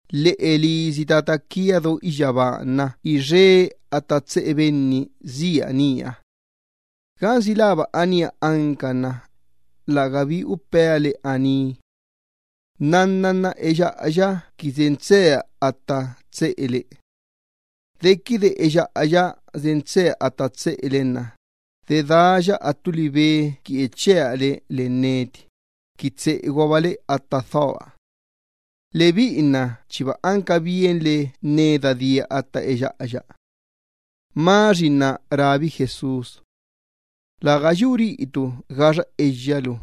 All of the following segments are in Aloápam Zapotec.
Lheꞌe lisi Tata quia do iyyabaaha nna ixe atta tseꞌe benni sia nía. Gansi läba anía anca nna lägabi upea le aní. Nnanna nna eyyaꞌaya qui sen tseea atta tseꞌele. Dequide eyyaꞌaya sen tseea atta tseꞌele nna dedaaya attu libe qui echea le len neti, qui tseꞌeguabale atta dhoa. Lebiꞌi nna chiba anca bienle neda dia atta eyyaꞌaya. Tomás rábi Jesús: —Läga yu riꞌitu gaxa eyyalu,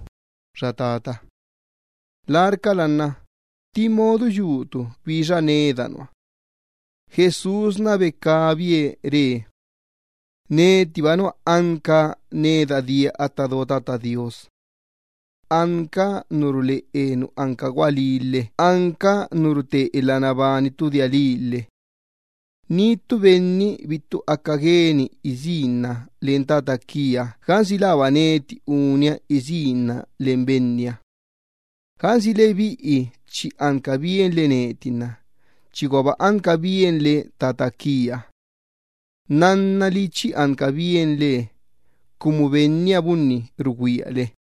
xa Benni bananie riꞌitu. Larcala nna ¿tti modu yutu bixa neda nua? Jesús becabie re: —Netiba nua anca neda dia atta do Tata Do Iyyabaaha. Anca nu ruleꞌe nu anca gualí lhe anca nu rute elha nabani ttu dia lii lhe. Ni ttu benni bittu aca gueni isínna len Tata quia gansi läba neti unia qui isínna len Benniha. Gansi lebiꞌi chi anca bienle neti nna chiguaba anca bienle Tata quia. Nnannali chi anca bienle, cumu Benniha bunni rugüiale.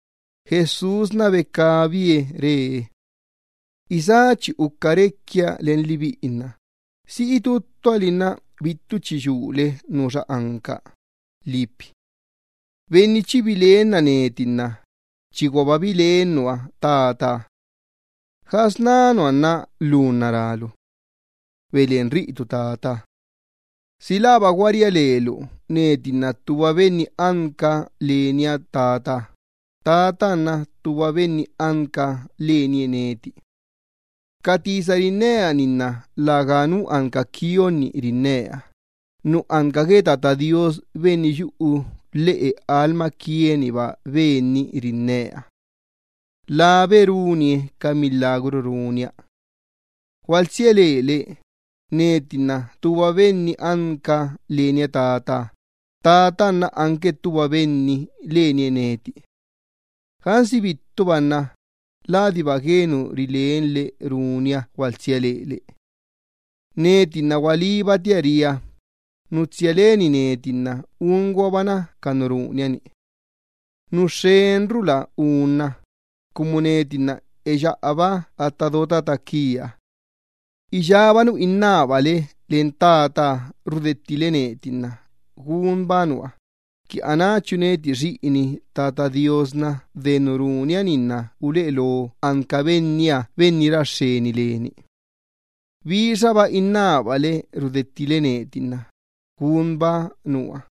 Jesús becabie re: —Felipe, isá chi uca requia len lebiꞌi nna ¿si itú ttuali nna bittu chi yulu nuxa anca? Benni chi bilenna neti nna chiguaba bilen nua Tataha. ¿Gasná nua nna lu nna rálu: “Beleꞌen riꞌitu Tataha”? ¿Si läba gua ria lelu, neti nna ttuba Benni anca lenia Tataha, Tataha nna ttuba Benni anca Benniha lenie neti? Ca tisa rinnea-ni nna läganu anca quionni rinnea, nu anca gue Tata Do Iyyabaaha Benni yuꞌu lheꞌe lastooa-niba Ben-ni rinnea. Labe runie ca milagru runia. Gualtsia lele, neti nna ttuba Benni anca lenia Tataha, Tataha nna ttuba Benni anque lenie neti. Gansi bittuba nna ladiba gue nu rilenle runia gualtsia lele. Neti nna gualíbatia ria, nu tsia leni neti nna unguabana ca nu runia-ni. Nu xxenrula unna cumu neti nna eyaꞌaba atta do Tata quia. Iyába nu innábale len Tataha rudettile láya nna gunba nua, qui anáchu neti xiꞌin Tata Do Iyyabaaha, de nu runia-ni nna uleꞌe lo anca Benniha Benni ra xxeni leni. Bixaba innábale rudettile láya nna gunba nua.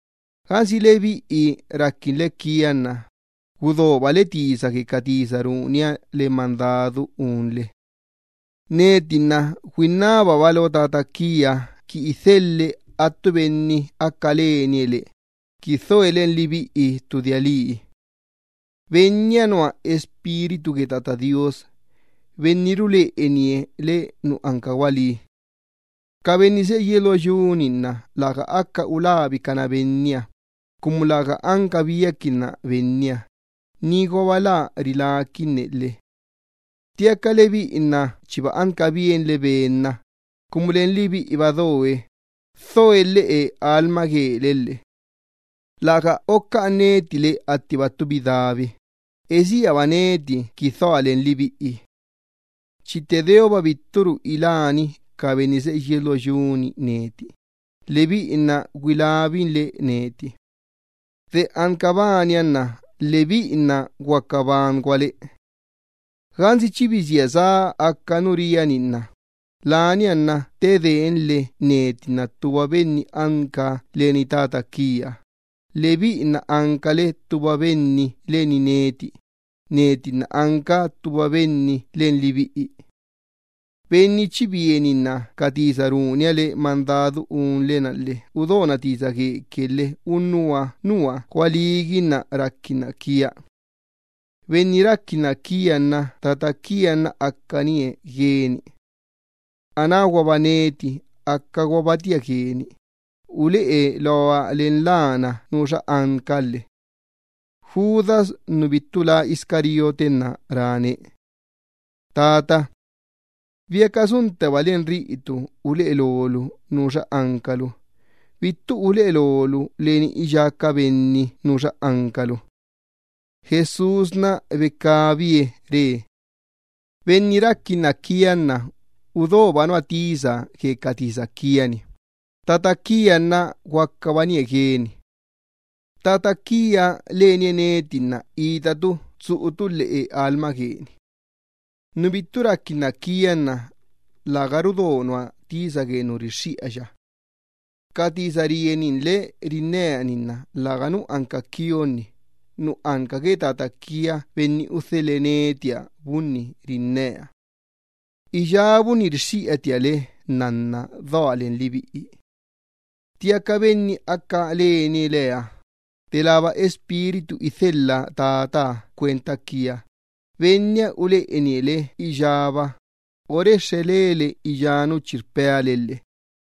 ’Gansi lebiꞌi raquinle quia nna gudobale tisa gue ca tisa runia le mandadu unle. Neti nna güinnababa lo Tata quia qui idhelhe attu Benni aca lanie le, qui dhoe len lebiꞌi ttu dia lii. Benniha nua Espíritu gue Tata Do Iyyabaaha, Benni ruleꞌenie le nu anca gualí. Ca benni seꞌe yies lo yu-ni nna läga ulabicana Benniha, cumu läga anca biaquinna Benniha, niguaba lä riláquinne lhe. Ttiaca lebiꞌi nna chiba anca bienle Ben-na, cumu len lebiꞌiba doe, dhoe lheꞌe lastoole lhe. ’Läga ocaꞌan neti le attiba ttu bidabi, esíaba neti qui dhoa len lebiꞌi. Chi tte deoba bitturu iláni ca benni seꞌe yies lo yu-ni neti, lebiꞌi nna güilabinle neti. De anca bania nna lebiꞌi nna guaca banguale. Gansi chi bisía sá aca nu ria-ni nna lania nna ttedeenle neti nna ttuba Benni anca lenia tata quiaha, lebiꞌi nna ancale ttuba benni leni neti, neti nna anca ttuba Benni len lebiꞌi. Benni chi bieninna ca tisa runia le mandadu unle-na lhe udona tisa gueque lhe unnuha nua gualíguinna raquinna quia. Benni raquinna quia nna Tata quia nna acanie gueni. Anáguaba neti acaguabatia gueni, uleꞌe loa len lana nuxa anca lhe. Judas nu bittu lá Iscariote nna ráne: —Tata, ¿biaca suntteba len riꞌitu uleꞌe lolu nuxa ancalu, bittu uleꞌe lolu leni iyá ca benni nuxa ancalu? Jesús becabie re: —Benni raquinna quia nna udoba nua tisa gue ca tisa quia-ni. Tata quia nna guaca banie gueni. Tata quia lenie neti nna itatu tsuꞌutu lheꞌe lastooni. Nu bittu raquinna quia nna läga rudo nua tisa gue nu rixxiꞌaya. Ca tisa rieninle rinnea-ni nna läga anca ca unní nu anca quia, nu anca gue Tata quia Benni udhelhe netiha bunni rinnea. ’Iyábunni rixxiꞌatia le, nnanna doa len lebiꞌi. Ttiaca Benni aca lanie leha, delába Espíritu idhelha Tataha cuenta quia, Benniha uleꞌenie le iyába, orexxe lele iyá nu chi rpea le lhe.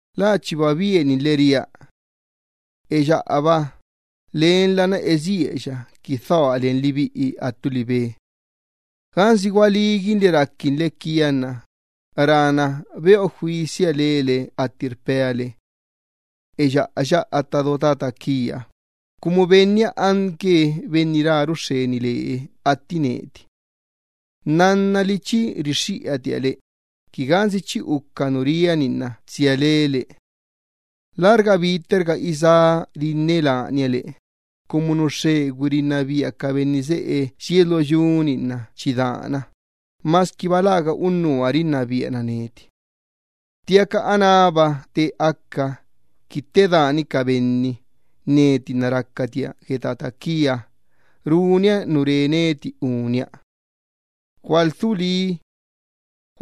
La chiba bieninle ria: “Eyyaꞌaba, lenla nna esíaya qui dhoa len lebiꞌi attu libe.” Gansi gualíguinle raquinle quia nna rana beꞌo juisia lele atti rpea le: “Eyyaꞌaya atta do Tata quia”, cumu Benniha anque Benni raru xxeni lee atti neti. Nnannali chi rixxiꞌatia le, qui gansi chi uca nu ria-ni nna tsia lele. ’Lärga bitterga isá rinne lania le, cumu nu xxegüi rinnabia ca benni seꞌe yies lo yu-ni nna chi dana, masquiba läga unnuha rinnabiana neti. Ttiaca anába te aca, qui ttedaani ca benni, neti nna racatia gue Tata quia, runia nu re neti unia lhe. ’Gualdhu lí.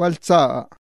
Gualtsá.